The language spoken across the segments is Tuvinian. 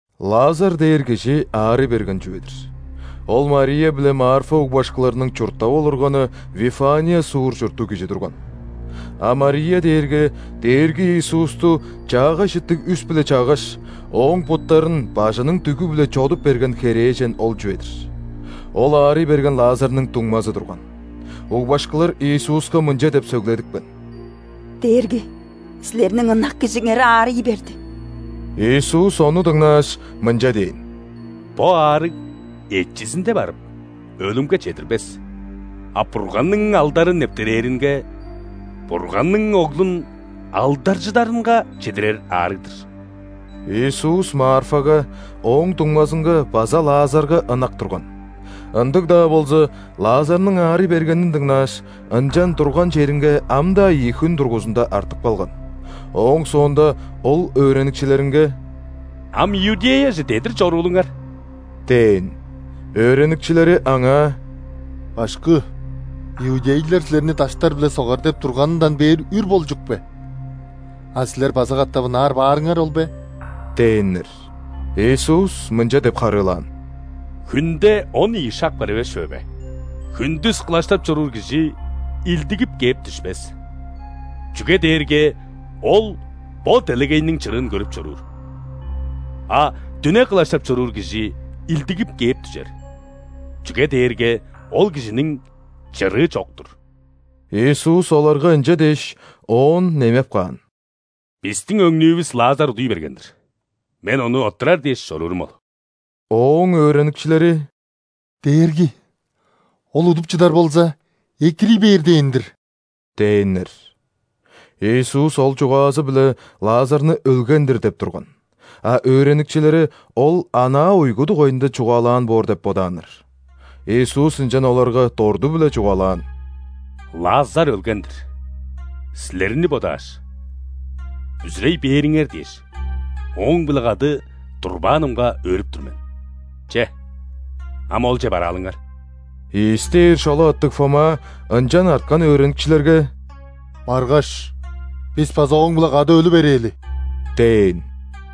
Лазар дээр кижи аарый берген чүве-дир. Ол Мария биле Марфа угбашкыларның чурттап олурганы Вифания суур чурттуг кижи турган. А Мария дээрге Дээрги Иисусту чаагай чыттыг үс-биле чаггаш, Ооң буттарын бажының дүгү-биле чодуп берген херээжен ол чүве-дир. Ол аарый берген Лазарның дуңмазы турган. Угбашкылар Иисуска мынча деп сөгледипкен: «Дээрги! Силерниң ынак кижиңер аарый берди». Иисус ону дыңнааш, мынча дээн: «Бо аарыг эчизинде барып, өлүмге чедирбес, а Бурганның алдары нептерээринге – Бурганның Оглун алдаржыдарынга чедирер аарыг-дыр». Иисус Марфага, ооң дуңмазынга база Лазарга ынак турган. Ындыг-даа болза, Лазарның аарый бергенин дыңнааш, ынчан турган черинге ам-даа ийи хүн дургузунда артып калган. Ооң соонда Ол өөреникчилеринге: «Ам Иудеяже дедир чоруулуңар» – дээн. Өөреникчилери Аңаа: «Башкы! Иудейлер Силерни даштар-биле согар деп турганындан бээр үр болчук бе, а Силер база катап ынаар баарыңар ол бе?» – дээннер. Иисус мынча деп харыылаан: «Хүнде он ийи шак бар эвес чүве бе? Хүндүс кылаштап чоруур кижи илдигип кээп дүшпес, чүге дээрге ол бо делегейниң чырыын көрүп чоруур. А дүне кылаштап чоруур кижи илдигип кээп дүжер, чүге дээрге ол кижиниң чырыы чок-тур». Иисус оларга ынча дээш, оон немеп каан: «Бистиң өңнүүвүс Лазар удуй берген-дир. Мен ону оттурар дээш чоруурум ол». Ооң өөреникчилери: «Дээрги! Ол удуп чыдар болза, экирий бээр дээн-дир» – дээннер. Иисус ол чугаазы-биле Лазарны өлген-дир деп турган, а өөреникчилери Ол анаа уйгу дугайында чугаалаан боор деп бодааннар. Иисус ынчан оларга дорту-биле чугаалаан: «Лазар өлген-дир. Силерни бодааш, бүзүрей бээриңер дээш, ооң-биле кады турбаанымга өөрүп тур мен. Че, ам олче бараалыңар». Ийис дээр шола аттыг Фома ынчан арткан өөреникчилерге: «Баргаш, бис база Ооң-биле кады өлү берээли» – дээн.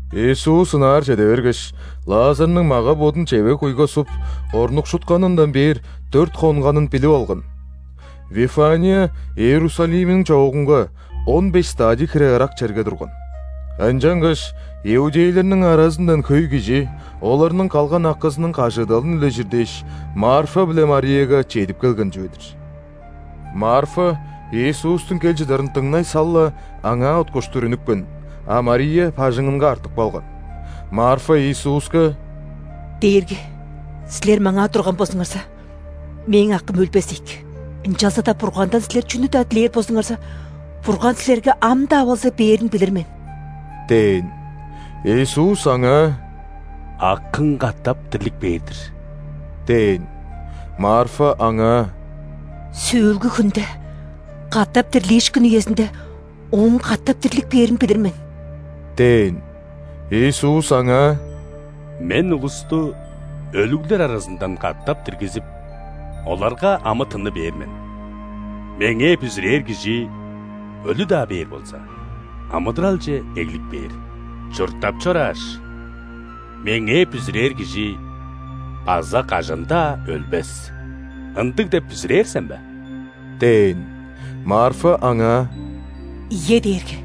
Иисус ынаар чеде бергеш, Лазарның мага-бодун чевег-куйга суп, орнукшутканындан бээр дөрт хонганын билип алган. Вифания Иерусалимниң чоогунга, он беш °стадий хире ырак черге турган. Ынчангаш иудейлерниң аразындан хөй кижи оларның калган акызының кажыыдалын үлежир дээш, Марфа биле Марияга чедип келген чүве-дир. Марфа Иисустуң кел чыдарын дыңнай сал-ла, Аңаа уткуштур үнүпкен, а Мария бажыңынга артып калган. Марфа Иисуска: «Дээрги! Силер маңаа турган болзуңарза, мээң акым өлбес ийик. Ынчалза-даа Бургандан Силер чүнү-даа дилээр болзуңарза, Бурган Силерге ам-даа болза бээрин билир мен» – дээн. Иисус аңаа: «Акың катап дирлип кээр-дир» – дээн. Марфа Аңаа: «Сөөлгү хүнде, катап дирлиишкин үезинде, ооң катап дирлип кээрин билир мен» – дээн. Иисус аңаа: «Мен улусту өлүглер аразындан катап диргизип, оларга амы-тынны бээр мен. Меңээ бүзүрээр кижи, өлү-даа бээр болза, амыдыралче эглип кээр. Чурттап чорааш, Меңээ бүзүрээр кижи база кажан-даа өлбес. Ындыг деп бүзүрээр сен бе?» – дээн. Марфа Аңаа: «Ийе, Дээрги!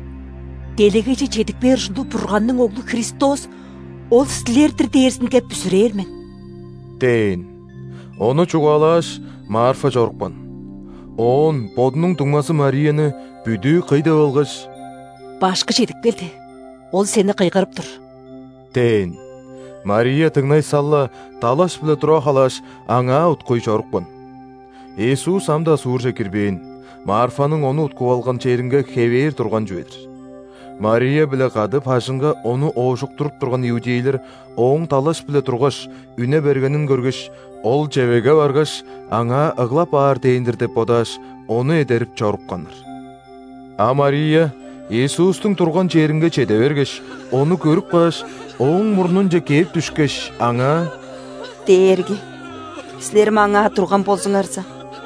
Делегейже чедип кээр ужурлуг Бурганның Оглу, Христос – Ол силер-дир дээрзинге бүзүрээр мен» – дээн. Ону чугаалааш, Марфа чорупкан, оон бодунуң дуңмазы Марияны бүдүү кый деп алгаш: «Башкы чедип келди. Ол сени кыйгырып тур» – дээн. Мария дыңнай сал-ла, далаш-биле тура халааш, Аңаа уткуй чорупкан. Иисус ам-даа суурже кирбээн, Марфаның Ону уткуп алган черинге хевээр турган чүве-дир. Мария-биле кады бажыңга ону оожуктуруп турган иудейлер ооң далаш-биле тургаш, үне бергенин көргеш, ол чевегге баргаш, аңаа ыглап аар дээн-дир деп бодааш, ону эдерип чорупканнар. А Мария Иисустуң турган черинге чеде бергеш, Ону көрүп кааш, Ооң мурнунче кээп дүшкеш, Аңаа: «Дээрги! Силер маңаа турган болзуңарза,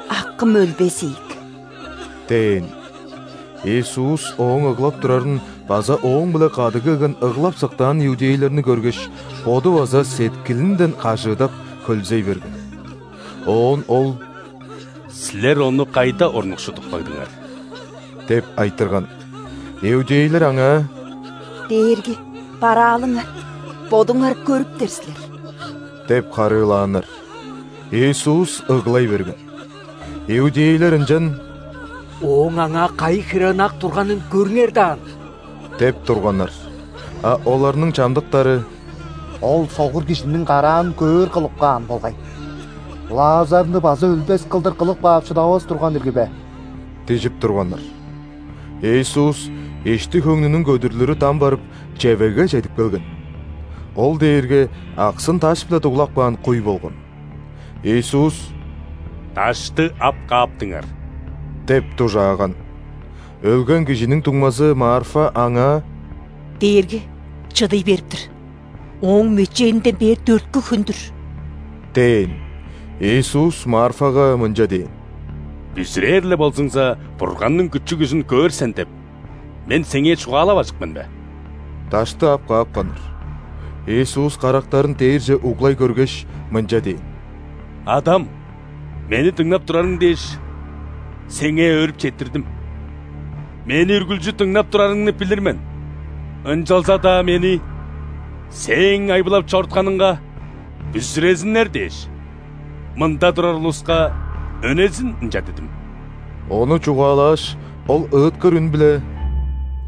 акым өлбес ийик!» – дээн. Иисус ооң ыглап турарын база ооң-биле кады келген ыглап-сыктаан иудейлерни көргеш, Боду база сеткилинден кажыыдап, хөлзей берген. Оон Ол: «Силер ону кайда орнукшудуп кагдыңар?» – деп айтырган. Иудейлер Аңаа: «Дээрги, бараалыңар, Бодуңар көрүптер силер» – деп харыылааннар. Иисус ыглай берген. Иудейлер ынчан: «Ооң аңаа кайы хире ынак турганын көрүңер даан!» – деп турганнар. А оларның чамдыктары: «Ол согур кижиниң караан көөр кылып каан болгай. Лазарны база өлбес кылдыр кылып каап шыдавас турган ирги бе?» – дижип турганнар. Иисус, ишти-хөңнүнүң көдүрлүрү дам барып, чевегге чедип келген. Ол дээрге аксын даш-биле дуглап каан куй болган. Иисус: «Дашты ап кааптыңар» – деп дужааган. Өлген кижиниң дуңмазы Марфа Аңаа: «Дээрги! Чыдый берип-тир. Ооң мөчээнинден бээр дөрткү хүн-дүр» – дээн. Иисус Марфага мынча дээн: «„Бүзүрээр-ле болзуңза, Бурганның күчү-күжүн көөр сен“ – деп, Мен сеңээ чугаалаважык мен бе?» Дашты ап каапканнар. Иисус карактарын дээрже углай көргеш, мынча дээн: «Адам! Мени дыңнап турарың дээш, Сеңээ өөрүп четтирдим. Мени үргүлчү дыңнап турарыңны билир мен. Ынчалза-даа Мени Сээң айбылап чорутканыңга бүзүрезиннер дээш, мында турар улуска өнезин ынча дидим». Ону чугаалааш, Ол ыыткыр үн-биле: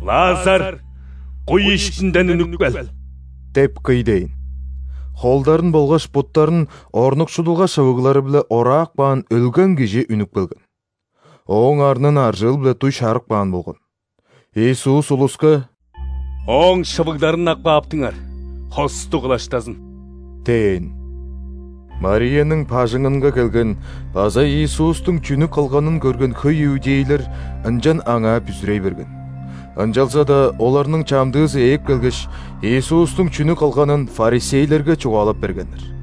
«Лазар, куй иштинден үнүп кел!» – деп кый дээн. Холдарын болгаш буттарын орнукшудулга шывыглары-биле ораап каан өлген кижи үнүп келген. Ооң арнын аржыыл-биле дуй шарып каан болган. Иисус улуска: «Ооң шывыгларын ап кааптыңар, хостуг кылаштазын!» – дээн. Марияның бажыңынга келген база Иисустуң чүнү кылганын көрген хөй иудейлер ынчан Аңаа бүзүрей берген. Ынчалза-даа оларның чамдыызы ээп келгеш, Иисустуң чүнү кылганын ·фарисейлерге чугаалап бергеннер.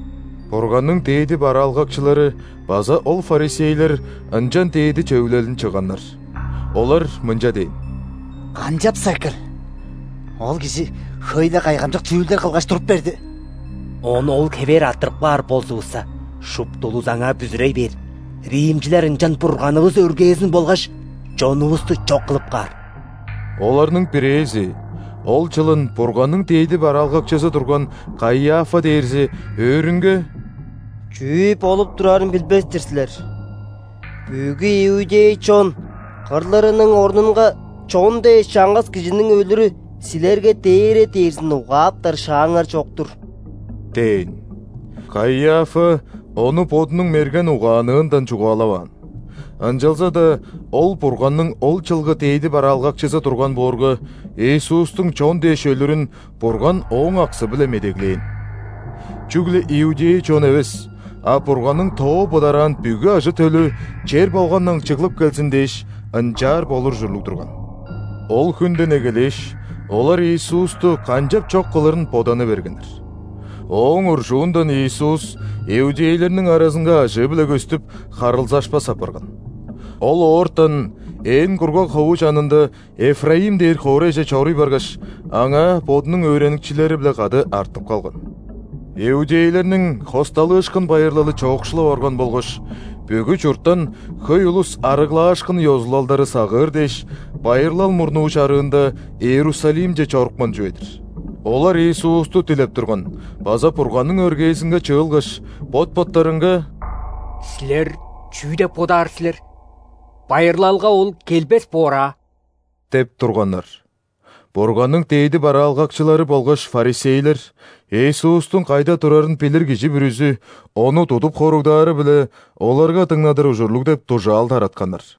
Бурганның дээди бараалгакчылары база ол фарисейлер ынчан дээди Чөвүлелин чыгганнар. Олар мынча дээн: «Канчапса экил? Ол кижи хөй-ле кайгамчык чүүлдер кылгаш туруп берди. Ону ол хевээр арттырып каар болзувусса, шупту улус Аңаа бүзүрей бээр. Римчилер ынчан Бурганывыс өргээзин болгаш чонувусту чок кылып каар». Оларның бирээзи, ол чылын Бурганның дээди бараалгакчызы турган Каиафа дээрзи өөрүнге: «Чүү болуп турарын билбес-тир силер! Бүгү иудей чон кырлырының орнунга, чон дээш, чаңгыс кижиниң өлүрү силерге дээре дээрзин угааптар шааңар чок-тур» – дээн. Каиафа ону бодунуң мерген угаанныындан чугаалаваан, ынчалза-даа ол Бурганның ол чылгы дээди бараалгакчызы турган боорга, Иисустуң чон дээш өлүрүн Бурган ооң аксы-биле медеглээн. Чүгле иудей чон эвес, а Бурганның тоо быдараан бүгү ажы-төлү чер болгандан чыглып келзин дээш, ынчаар болур ужурлуг турган. Ол хүнден эгелээш, олар Иисусту канчап чок кылырын боданы бергеннер. Ооң уржуундан Иисус иудейлерниң аразынга ажыы-биле көстүп, харылзашпас апарган. Ол оортан ээн кургаг хову чанында Эфраим дээр хоорайже чоруй баргаш, аңаа Бодунуң өөреникчилери-биле кады артып калган. Иудейлерниң ·Хосталыышкын байырлалы чоокшулап орган болгаш, бүгү чурттан хөй улус ·арыглаашкын ёзулалдары сагыыр дээш, байырлал мурнуу чарыында Иерусалимче чорупкан чүве-дир. Олар Иисусту дилеп турган база Бурганның өргээзинге чыылгаш, бот-боттарынга: «Силер чүү деп бодаар силер? Байырлалга Ол келбес боор аа?» – деп турганнар. Бурганның дээди бараалгакчылары болгаш ·фарисейлер Иисустуң кайда турарын билир кижи бүрүзү Ону тудуп хоругдаары-биле оларга дыңнадыр ужурлуг деп дужаал таратканнар.